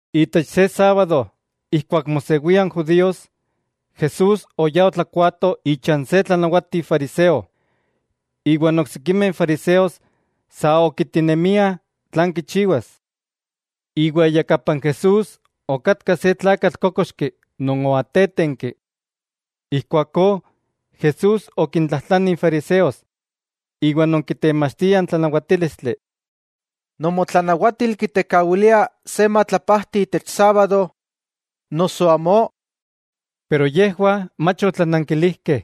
Itech se sábado ijkuak mosewia n judíos, Jesús oyá otlakuaato icha n se tlanawati fariseo. Iwa n oksikimeh fariseos sa okiitinemiah tlan kichiwas. Iwa iyakapa n Jesús okatka se tlakatl kókoxki non oatétenki. Ijkuakó Jesús okintlajtlani n fariseos iwa non kitemachtiah n tlanawatílistli: —¿Nomotlanawatil kitekawilia se matlapajti itech sábado, noso amó? Yejwah mach otlanankilijkeh.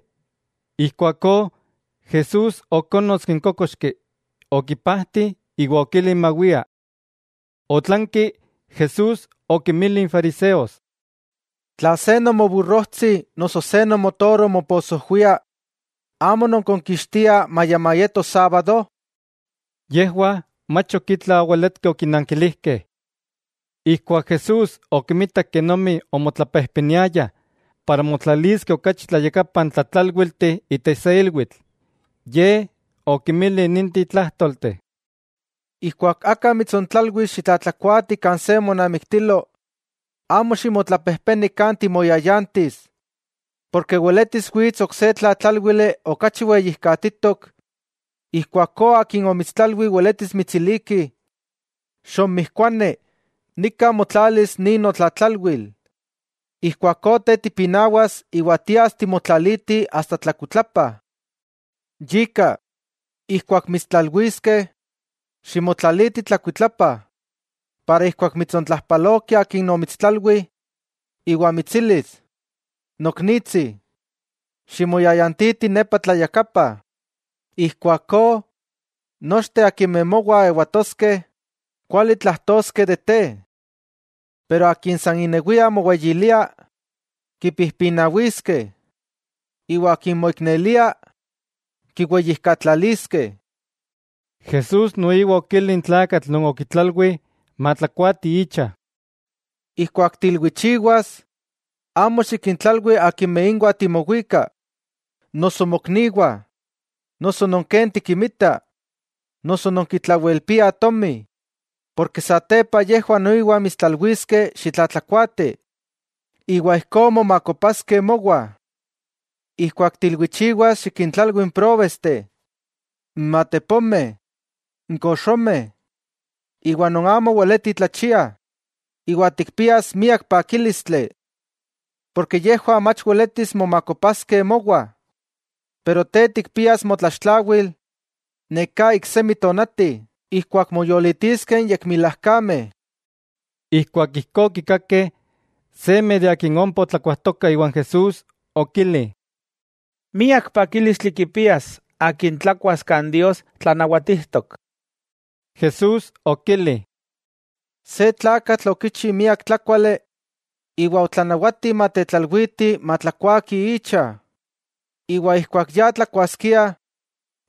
Ijkuakó Jesús okonkitski n kókoxki, okipajti iwa okili mawia. Otlanki Jesús okinmili n fariseos: —Tla se nomoburrojtsi noso se nomotoro moposojwia, ¿amo nonkonkixtiah maya mayeto sábado? Yejwah mach ok itla oweletkeh okinankilijkeh. Ijkuak Jesús okimitak kenomi omotlapejpeniayah para motlaliskeh okachi tlayakapa n tlatlálwilteh itech se ilwitl, Ye okinmili ninteh tlajtolteh: —Ijkuak aka mitsontlalwis xitlatlakuaati kan se monamiktilo, amo ximotlapejpeni kan timoyayantis, porke weletis wits ok se tlatlálwili okachi weyijkatitok; ijkuakó akin omitstlalwi weletis mitsiliki: “Xonmijkuani, nika motlalis nin notlatlalwil.” Ijkuakó te tipinawas iwa tias timotlaliti asta tlakuitlapa. Yika, ijkuak mitstlalwiskeh, ximotlaliti tlakuitlapa; ijkó mitsontlajpaloki akin omitstlalwi, iwa mitsilis: “Noknitsi, ximoyayantiti nepa tlayakapa.” Ijkuakó, nochteh akimeh mowah ewatoskeh, kuali tlajtoskeh de te. Pero akin inewia moweyilia, kipijpinawiskeh; iwa akin moiknelia, kiweyijkatlaliskeh. Jesús noiwa okili n tlakatl non okitlalwi matlakuati icha: —Ijkuak tiilwichiwas, amo xikintlalwi akimeh inwah timowika, noso mokniwah, noso non ken tikimita, noso non kitlawelpiah tomi; porke satepa yejwah noiwa mitstlalwiskeh xitlatlakuaati, iwa ijkó momakopaskeh mowah. Ijkuak tiilwichiwas xikintlalwi n próbesteh, n matepomeh, n koxomeh iwa non amo weleti tlachiah, iwa tikpias miak pakílistli. Porke yejwah mach weletis momakopaskeh mowah, pero te tikpias motlaxtlawil neká iksemi tonati ijkuak moyolitiskeh n yekmilajkameh. Ijkuak ijkó okikakeh, seme non ompa otlakuajtokah iwan Jesús, okili: —¡Miak pakílistli kipias akin tlakuas kan Dios tlanawatijtok! Jesús okili: —Se tlakatl okichi miak tlákuali iwa otlanawati matetlalwitih matlakuakih icha. Iwa ijkuak ya tlakuaskiah,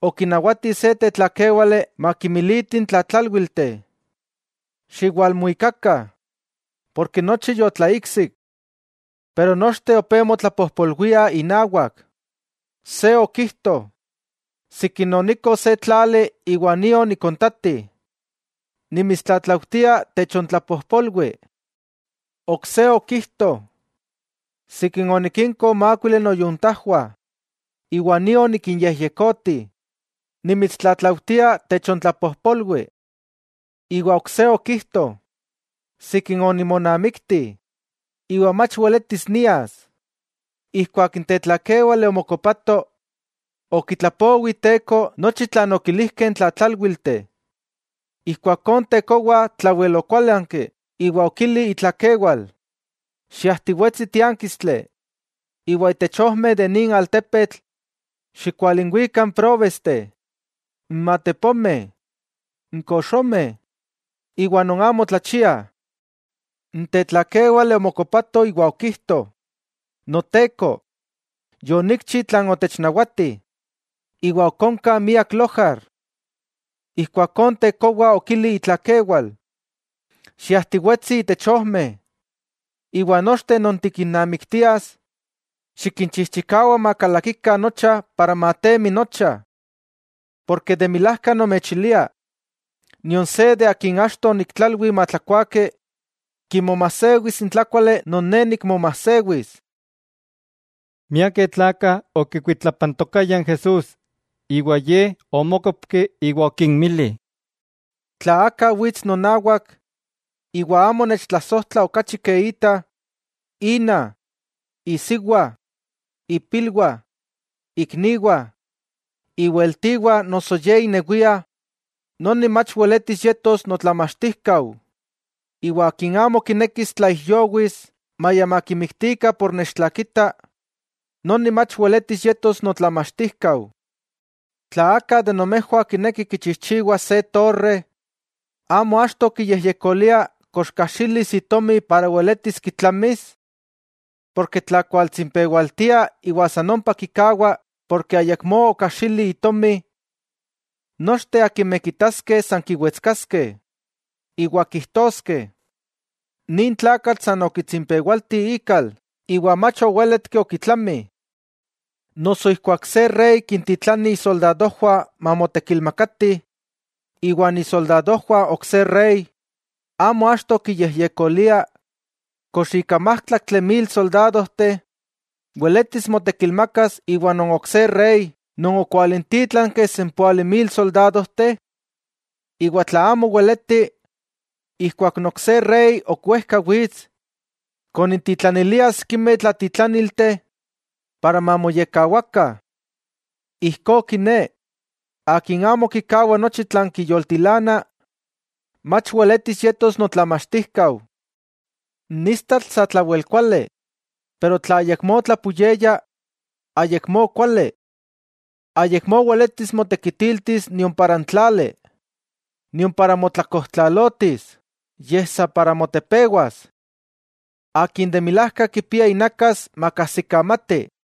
okinawati se tetlakéwale makimiliti n tlatlálwilteh: “Xiwalmuikakah, porke nochi yotlaiksik.” Pero nochteh opé motlapojpolwiah inawak. Se okijto: “Sikin onikko se tlali, iwa nio nikontati; nimitstlatlaujtia techontlapojpolwi.” Ok se okijto: “Sikin onikinko mákuili noyuntajwah, iwa nio nikinyejyekoti, nimitstlatlaujtia techontlapojpolwi.” Iwa ok se okijto: “Sikin onimonamikti, iwa mach weletis nias.” Ijkuak n tetlakéwale omokopato, okitlapowi iteko nochi tlan okilijkeh n tlatlálwilteh. Ijkuakó n tekowa tlawel okuálanki iwa okili itlakewal: “Xiajtiwetsi tiánkistli iwa itech ojmeh de nin altepetl, xikualinwika n próbesteh, n matepomeh, n koxomeh iwa non amo tlachiah.” N tetlakéwale omokopato iwa okijto: “Noteko, yonikchi tlan otechnawati, iwa ok onka miak lojar.” Ijkuakó n tekowa okili itlakewal: “Xiajtiwetsi itech ojmeh, iwa nochteh non tikinnamiktias xikinchijchikawa makalakikah nocha para matemi nocha. Porke de milajka nomechilia, nion se de akin achto oniktlalwi matlakuaki, kimomasewis n tlákuali non ne nikmomajsewis.” Miakeh tlakah okikuitlapantokayah n Jesús, iwa Ye omókopki iwa okinmili: —Tla aka wits nonawak, iwa amo nechtlasojtla okachi ke ita, ina, isiwa, ipilwah, ikniwah, iweltiwah noso ye inewia, noni mach weletis yetos notlamachtijkau. Iwa akin amo kinekis tlaijyowis maya makimiktikah por nechtlakita, noni mach weletis yetos notlamachtijkau. Tla aka de nomejwah kineki kichijchiwas se torre, ¿amo achto kiyejyekolia kox kajxilis itomi para weletis kitlamis? Porke tla kualtsimpewaltia iwa san ompa kikawa ken ayakmó okajxili itomi; nochteh akimeh kitaskeh san kiwetskaskeh, iwa kijtoskeh: “Nin tlakatl san okitsimpewalti ikal iwa mach owéletki okitlami.” Noso ijkuak se rey kintitlani isoldadojwah mamotekilmakatih iwan isoldadojwah ok se rey, ¿amo achto kiyejyekolia kox ika májtlaktli mil soldadojteh weletis motekilmakas iwa non ok se rey non okwalintítlanki sempóali mil soldadojteh? Iwa tla amo weleti, ijkuak n ok se rey ok wejka wits, konintitlanilia sikimeh tlatitlaniltih para mamoyekkawakah. Ijkó kiné, akin amo kikawa nochi tlan kiyoltilana, mach weletis yetos notlamachtijkau. 'N istatl satlawel kuali, pero tla ayakmó tlapuyeya, ayakmó kuali. Ayakmó weletis motekitiltis nion itech tláli, nion para motlakojtlalotis, yej sa para motepewas. ¡Akin de milajka kipia inakas, makajsikamati!